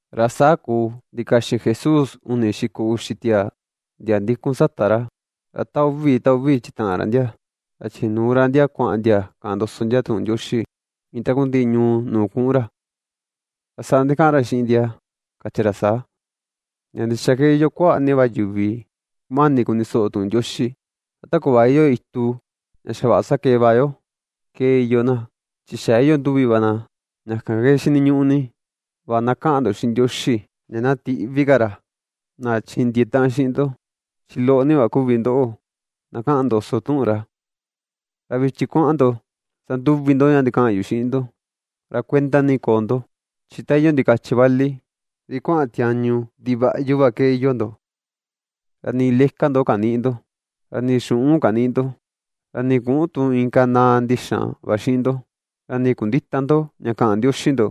Ra saa kuu ndikaxin Jesús uni xiko uxi tiaa, ndia ndikun sata ra, ra ta uvi, ta uvi chitaꞌan ra ndia. Ra chinuu ra ndia kuaꞌan ndia kaꞌan ndoso ndia tuꞌun Ndioxi iin takundiꞌi ñuu nuu kuꞌun ra. Ra saa ndikaꞌan ra xiꞌin ndia, kachi ra saa: ―Ña ndixa ke iyoo kuaꞌa ni va yuvi kumani kuni soꞌo tuꞌun Ndioxi. Ra ta kuꞌva iyoo itu ña xa vaꞌa sakee va yo, ke iyoo na, chi xa iyoo nduvi va na. Ña kan ke xiniñuꞌu ni va kaꞌan ndo xiꞌin Ndioxi ña na tiꞌvi ka ra, na chindiee taꞌan xiꞌin ndo, chi loꞌo ni va kuvi ndoꞌo na kaꞌan ndoso tuꞌun ra. Ra vichin kuaꞌan ndo sanduvi ndo ña ndikaꞌan yu xiꞌin ndo. Ra kuenda ni na koo ndo, chi ta iyoo ndikachi vali ri kuaꞌan tiañu ndivaꞌyu va ke iyoo ndo. Ra nii leka ndo kanïꞌi ndo, ra nii xuꞌun kanïꞌi ndo, ra nii küꞌun tu inka naꞌa ndixan va ndo xiꞌin ndo, ra nii kundïta ndo ña kaꞌan ndioxi ndo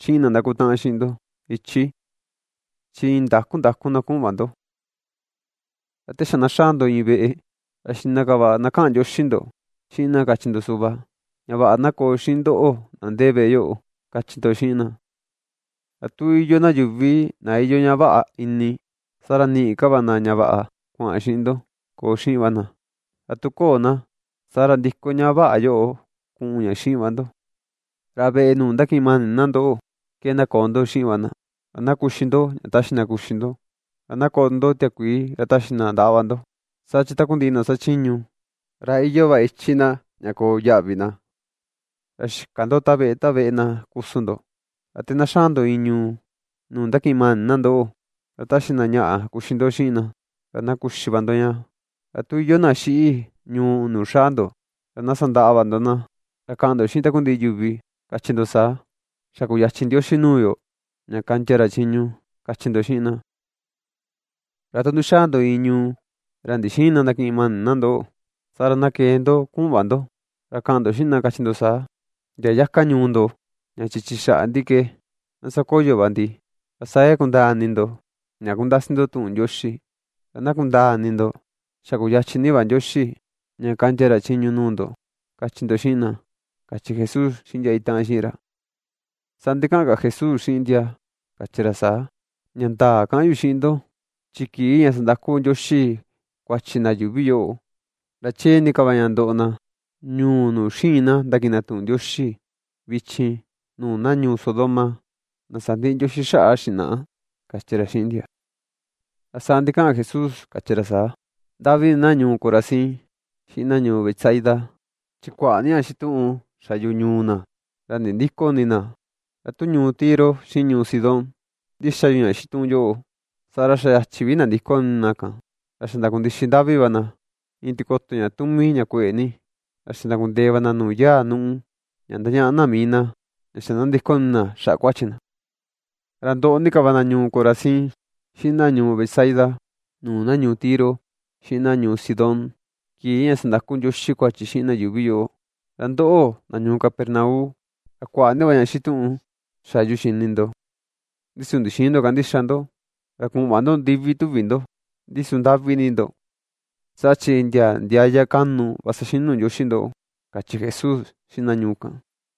xiꞌin na ndakutaꞌan xiꞌin ndo ichi. Chi iin ndaku ndaku na kuꞌun va ndo. Ra te xa na xaa ndo iin veꞌe, ra xiꞌna ka va na kaꞌan ndioxi ndo xiꞌin na kachi ndo suꞌva: “Ña vaꞌa na koo xiꞌin ndoꞌo na ndee veꞌe yoꞌo”, kachi ndo xiꞌin na. Ra tu iyoo yuvi na iyoo ña vaꞌa ini, saa ra niꞌi ka na ña vaꞌa kuaꞌan xiꞌin ndo, koo xiꞌin va na, ra tu köo na, saa ra ndiko ña vaꞌa yoꞌo kuꞌun ña xiꞌin va ndo. Ra veꞌe nuu ndakiꞌin mani na ndoꞌo ke na koo ndo xiꞌin va na. Ra na kuxi ndo ña taxi na kuxi ndo, ra na koꞌo tu ndo tiakuii ra taxi na ndaꞌa va ndo. Saa chi takundiꞌi na xachiñu, ra iyoo va ichi na ña koo yaꞌvi na. Ra xïka ndo ta veꞌe ta veꞌe na kusun ndo. Ra te na xaa ndo iin ñuu, nuu ndakiꞌin mani na ndoꞌo, ra taxi na ñaꞌa kuxi ndo xiꞌin na, ra na kuxi va ndo ña. Ra tu iyoo na xiꞌi ñuu nuu xaa ndo, ra na sandaꞌa va ndo na. Ra kaꞌan ndo xiꞌin takundiꞌi yuvi, kachi ndo saa: “Xa kuyachin Ndioxi nuu yo ña kaꞌndia ra chiñu”, kachi ndo xiꞌin na. Ra tu ndixaa ndo iin ñuu ra ndixïin na ndakiꞌin mani na ndoꞌo, saa ra na kee ndo kuꞌun va ndo ra kaꞌan ndo xiꞌin na kachi ndo saa: “Ndia yaka ñuu ndo ña chichi xaꞌa ndi ke na sakoyo va ndi, ra saa ke kundaa ini ndo ña kundasi ndo tuꞌun Ndioxi, ra na kundaa ini ndo, chi xa kuyachin ni va Ndioxi ña kaꞌndia ra chiñu nuu ndo”, kachi ndo xiꞌin na ―kachi Jesús xiꞌin ndia itaꞌan xiꞌin ra. Saa ndikaꞌan ka Jesús xiꞌin ndia, kachi ra saa: ―Ña ndaa kaꞌan yu xiꞌin ndo, chi kii ña sandaku Ndioxi kuachi na yuuvi yoꞌo, ra chee ni ka va ña ndoꞌo na ñuu nuu xïin na ndakiꞌin na tuꞌun Ndioxi vichin nuu na ñuu Sodoma, na sandiꞌi Ndioxi xaꞌa xinaꞌa ―kachi ra xiꞌin ndia. Ra saa ndikaꞌan Jesús kachi ra saa: ―¡Ndaꞌvi ni na ñuu Corazín, xiꞌin na ñuu Betsaida! Chi kuaꞌa ni ña xituꞌun xa yu ñuu na, ra nindïko ini na. Ra tu ñuu Tiro xiꞌin ñuu Sidón ndixa yu ña xituꞌun yoꞌo, saa ra xa yachi vi nandiko ini na kan, ra xa ndakundixi ndaꞌvi va na iin tikoto ña tumi ña kueꞌe ni, ra xa ndakundee va na nuu yaa nuꞌu, ña ndañaꞌa na mii na ña xa ^nandiko ini na xaꞌa kuachi na. Ra ndoꞌo ni ka va na ñuu Corazín, xiꞌin na ñuu Betsaida, nuu na ñuu Tiro, xiꞌin na ñuu Sidón, kii ña sandaku Ndioxi kuachi xiꞌin na yuuvi yoꞌo. Ra ndoꞌo, na ñuu Capernaum, ra kuaꞌa ni va ña xituꞌun xa yu xini ndo. Ndi su ndixïin ndo kandixa ndo, ra kuꞌun va ndo ndivi tuvi ndo, ndi su ¡ndaꞌvi ni ndo!, saa chi, ndia ndiaya kaꞌnu va saxinu Ndioxi ndoꞌo ―kachi Jesús xiꞌin na ñuu kan.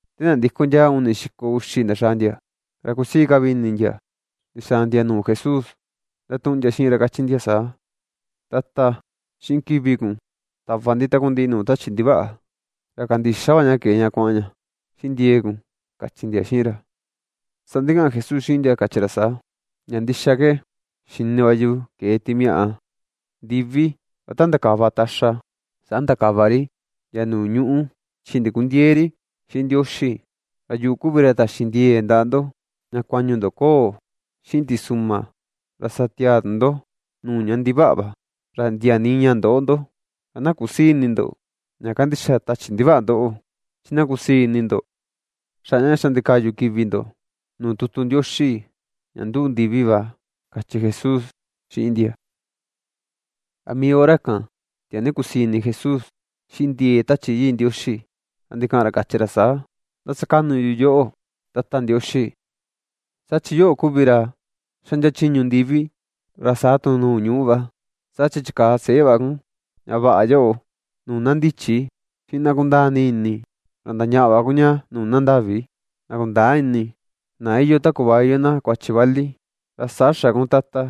Ta nandiko ndia uni xiko uxi ndaxaa ndia, ra kusii ka vi ini ndia ndixaa ndia nuu Jesús, ndatuꞌun ndia xiꞌin ra kachi ndia saa: ―Tata, xiꞌin kivi kun tava ndi takundiꞌi nuu tachi ndivaꞌa. Ra kandixa va ña kee ña kuaꞌan ña xiꞌin ndiee kun ―kachi ndia xiꞌin ra. Saa ndikaꞌan Jesús xiꞌin ndia kachi ra saa: ―Ña ndixa ke, xini va yu ke̱e timiaꞌa ndivi. Ra iin ta ndakava taxa, saa ndakava ri ndia nuu ñuꞌu chi ndikundiëe ri xiꞌin Ndioxi. Ra yuꞌu kuvi ra taxi ndie̱e̱ ndaꞌa ndo, ña kuañu ndo koo xiꞌin tisuꞌma; ra sa tiaa tu ndo nuu ña ndivaꞌa va. Ra ndia nii ña ndöꞌo ndo. Ra na kusïi ini ndo ña kandixa tachi ndivaꞌa ndoꞌo, chi na kusii ini ndo xaꞌa ña xa ndikaꞌyu kivi ndo nuu tutu Ndioxi ña nduꞌu ndivi va ―kachi Jesús xiꞌin ndia. Ra mii hora kan tiaa nii kusii ini Jesús xiꞌin ndiee Tachi Yii Ndioxi, ra ndikaꞌan ra kachi ra saa: ―Ndasakaꞌnu yu yoꞌo, Tata Ndioxi, saa chi yoꞌo kuvi ra xaꞌndia chiñu ndivi ra saa tu ñuꞌu va, saa chi chikaa seꞌe va kun ña vaꞌa yoꞌo nuu na ndichi xiꞌin na kundaa ni ini, ra ndañaꞌa va kun ña nuu na ndaꞌvi, na kundäa ini, na iyoo ta kuꞌva iyoo na kuachi vali, ra saa xa kun, Tata,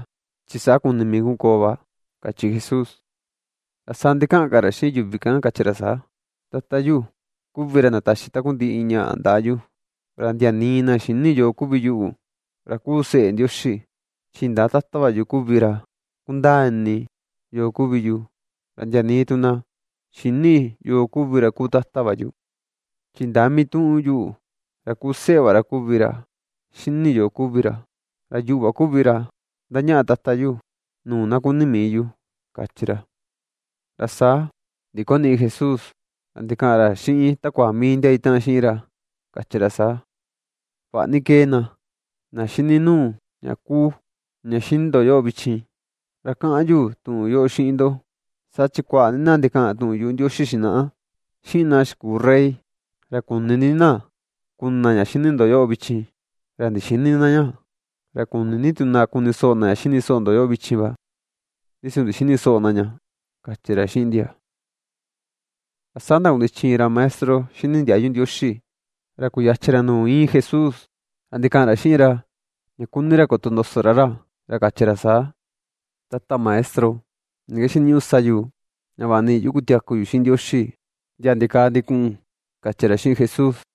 chi saa kuni mii kun koo va ―kachi Jesús. Ra saa ndikaꞌan ka ra xiꞌin yuvi kan kachi ra saa: ―Tata yu kuvi ra ndataxi takundiꞌi ñaꞌa ndaꞌa yu, ra ndia nii na xïni yo kuvi yuꞌu, ra kuu seꞌe Ndioxi, chi indaa Tata va yu kuvi ra kundaa ini yo kuvi yu, ra ndia nii tu na xïni yo kuvi ra kuu Tata va yu, chi indaa mituꞌun yuꞌu ra kuu seꞌe va ra kuvi ra xini yo kuvi ra, ra yuꞌu va kuvi ra ^ndañaꞌa Tata yu nuu na kuni mii yu ―kachi ra. Ra saa ndikoniꞌi Jesús, ra ndikaꞌan ra xiꞌin takua mii ndia itaꞌan xiꞌin ra, kachi ra saa: ―Vaꞌa ni ^kee na ^xini nuu ña kuu, ña xini ndo yoꞌo vichin; ra kaꞌan yu tuꞌun yoꞌo xiꞌin ndo, saa chi kuaꞌa ni na ndikaꞌan tuꞌun yuꞌu Ndioxi xinaꞌa, xiꞌin na xikuu rey, ra kuni ni na kuni na ña xini ndo yoꞌo vichin, ra ndixïni na ña; ra kuni ni tu na kuni soꞌo na ña xini soꞌo ndo yoꞌo vichin va, ndi su ndixïni soꞌo na ña ―kachi ra xiꞌin ndia. Ra saa ndakundichi iin ra maestro xini ndiayu Ndioxi ra kuyachin ra nuu iin Jesús ra ndikaꞌan ra xiꞌin ra ña kuni ra kotondoso ra ra. Ra kachi ra saa: ―Tata Maestro, ¿ni ke xiniñuꞌu sa yu ña vaꞌa niꞌi yu kutiaku yu xiꞌin Ndioxi ndia ndikaa ndikuꞌun? ―kachi ra xiꞌin Jesús.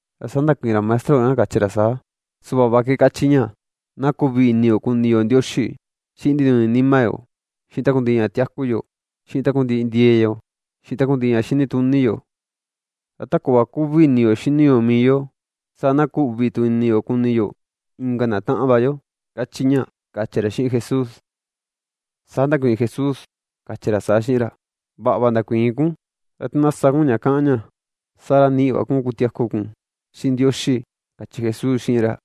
Ra saa ndakuiin ra maestro kan kachi ra saa: ―Suꞌva va ke kachi ña: “Na kuꞌvi ini yo kuni yo Ndioxi xiꞌin ndinuni nima yo, xiꞌin takundiꞌi ña tiaku yo, xiꞌin takundiꞌi ndie̱e̱ yo, xiꞌin takundiꞌi ña xini tuni yo; ra ta kuꞌva kuꞌvi ini yo xini yo mii yo, saa na kuꞌvi tu ini yo kuni yo inka na taꞌan va yo”, kachi ña ―kachi ra xiꞌin Jesús. Saa ndakuiin Jesús, kachi ra saa xiꞌin ra: ―Vaꞌa va ndakuiin kun. Ra tu na sa kun ña kaꞌan ña, saa ra niꞌi va kun kutiaku kun xiꞌin Ndioxi ―kachi Jesús xiꞌin ra.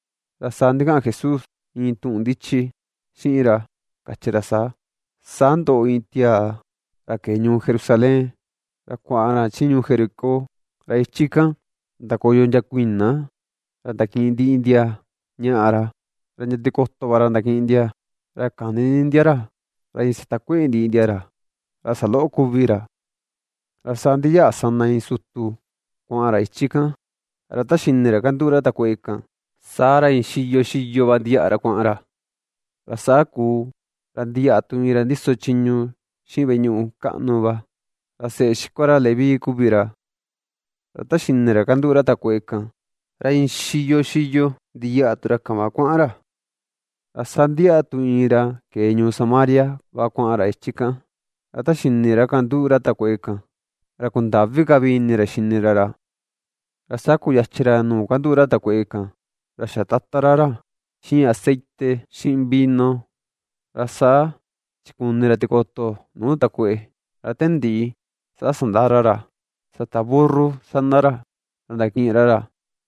Ra saa ndikaꞌan Jesús iin tuꞌun ndichi xiꞌin ra kachi ra saa: ―Saa ndoꞌo iin tiaa ra ke̱e ñuu Jerusalén, ra kuaꞌan ra chi ñuu Jericó. Ra ichi kan ndakoyo ndia kuiꞌna, ra ndakiꞌin ndiꞌi ndia ñaꞌa ra, ra ndia tikoto va ra ndakiꞌin ndia. Ra kani ni ndia ra; ra iin satakueꞌe ndiꞌi ndia ra; ra saloꞌo kuvi ra. Ra saa ndiyaꞌa sana iin sutu kuaꞌan ra ichi kan, ra ta xini ra kanduꞌu ra takueꞌe kan, saa ra iin xiyo xiyo va ndiyaꞌa ra kuaꞌan ra. Ra saa kuu ra ndiyaꞌa tu iin ra ndiso chiñu xiꞌin veꞌe ñuꞌu kaꞌnu va, ra seꞌe xikua ra Leví kuvi ra. Ra ta xini ra kanduꞌu ra takueꞌe kan, ra iin xiyo xiyo ndiyaꞌa tu ra kan va kuaꞌan ra. Ra saa ndiyaꞌa tu iin ra kee ñuu Samaria va kuaꞌan ra ichi kan, ra ta xini ra kanduꞌu ra takueꞌe kan, ra kundaꞌvi ka vi ini ra xini ra ra. Ra saa kuyachin ra nuu kanduꞌu ra takueꞌe kan, ra xatatan ra ra. Xiꞌin aceite xiꞌin vino, ra saa chikuꞌni ra tikoto nuu takueꞌe. Ra ta ndiꞌi saa sandaa ra ra sata burru sana ra, ra ndakiꞌin ra ra,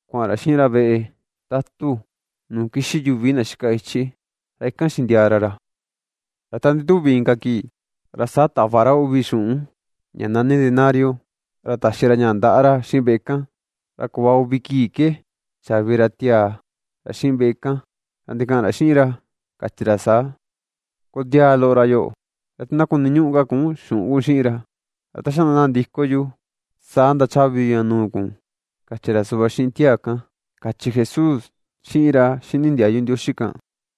kuaꞌan ra xiꞌin ra veꞌe tatu nuu kixi yuvi na xika ichi, ra ikan xindiaa ra ra. Ra ta ndituvi inka kii, ra saa tava ra uvi xuꞌun ña nani denario, ra taxi ra ña ndaꞌa ra xiꞌin veꞌe kan. Ra kuꞌva uvi kii ke chaꞌvi ra tiaa ra xiꞌin veꞌe kan. Ra ndikaꞌan ra xiꞌin ra, kachi ra saa: “Kondiaa loꞌo ra yoꞌo; ra tu na kuniñuꞌu ka kun xuꞌun kun xiꞌin ra, ra ta xa na ndiko yu saa ndachaꞌvi yu ña nuu kun”, kachi ra suꞌva xiꞌin tiaa kan ―kachi Jesús xiꞌin ra xini ndiayu Ndioxi kan.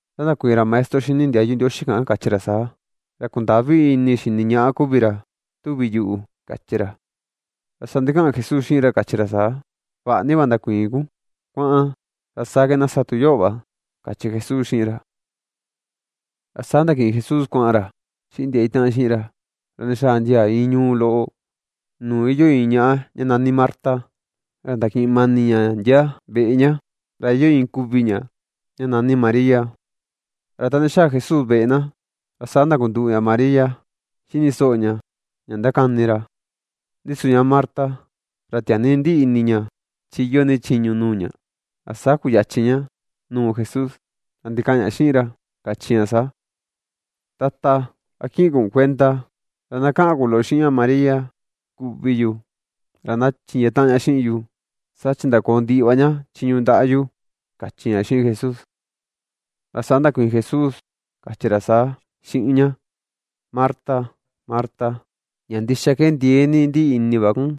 Saa ndakuiin ra maestro xini ndiayu Ndioxi kan kachi ra saa: ―Ra kundaꞌvi ini xini ñaꞌa kuvi ra, tuvi yuꞌu ―kachi ra. Ra saa ndikaꞌan Jesús xiꞌin ra kachi ra saa: ―Vaꞌa ni va ndakuiin kun. Kuaꞌan, ra saa ke na sa tu yoꞌo va ―kachi Jesús xiꞌin ra. Ra saa ndakiꞌin Jesús kuaꞌan ra xiꞌin ndia itaꞌan xiꞌin ra, ra ndixaa ndia iin ñuu loꞌo, nuu iyoo iin ñaꞌa ña nani Marta ra ndakiꞌin mani ña ndia veꞌe ña. Ra iyoo iin kuꞌvi ña ña nani María. Ra ta ndixaa Jesús veꞌe na, ra saa ndakunduꞌu ña María xini soꞌo ña ña ndakani ra. Ndi su ña Marta ra tiaa ni ndiꞌi ini ña chi iyoo ni chiñu nuu ña, ra saa kuyachin ña nuu Jesús, ra ndikaꞌan ña xiꞌin ra, kachi ña saa: ―Tata, ¿a kiꞌin kun kuenda? Ra na kaꞌan kun loꞌo xiꞌin ña María, kuꞌvi yu, ra na chindiee taꞌan ña xiꞌin yu. Saa chi ndakoò ndiꞌi va ña chiñu ndaꞌa yu ―kachi ña xiꞌin Jesús. Ra saa ndakuiin Jesús, kachi ra saa xiꞌin ña: ―Marta, Marta, ña ndixa ke ndiee ni ndiꞌi ini va kun,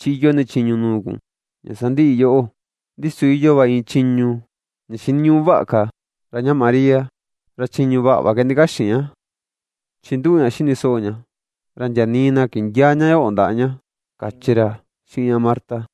chi iyoo ni chiñu nuu kun ña sandiꞌi yoꞌo. Ndi su iyoo va iin chiñu ña xiniñuꞌu vaꞌa ka, ra ña María ra chiñu vaꞌa va ke ndikaxin ña, chi nduꞌu ña xini soꞌo ña. Ra ndia nii na kindiäa ña yoꞌo ndaꞌa ña ―kachi ra xiꞌin ña Marta.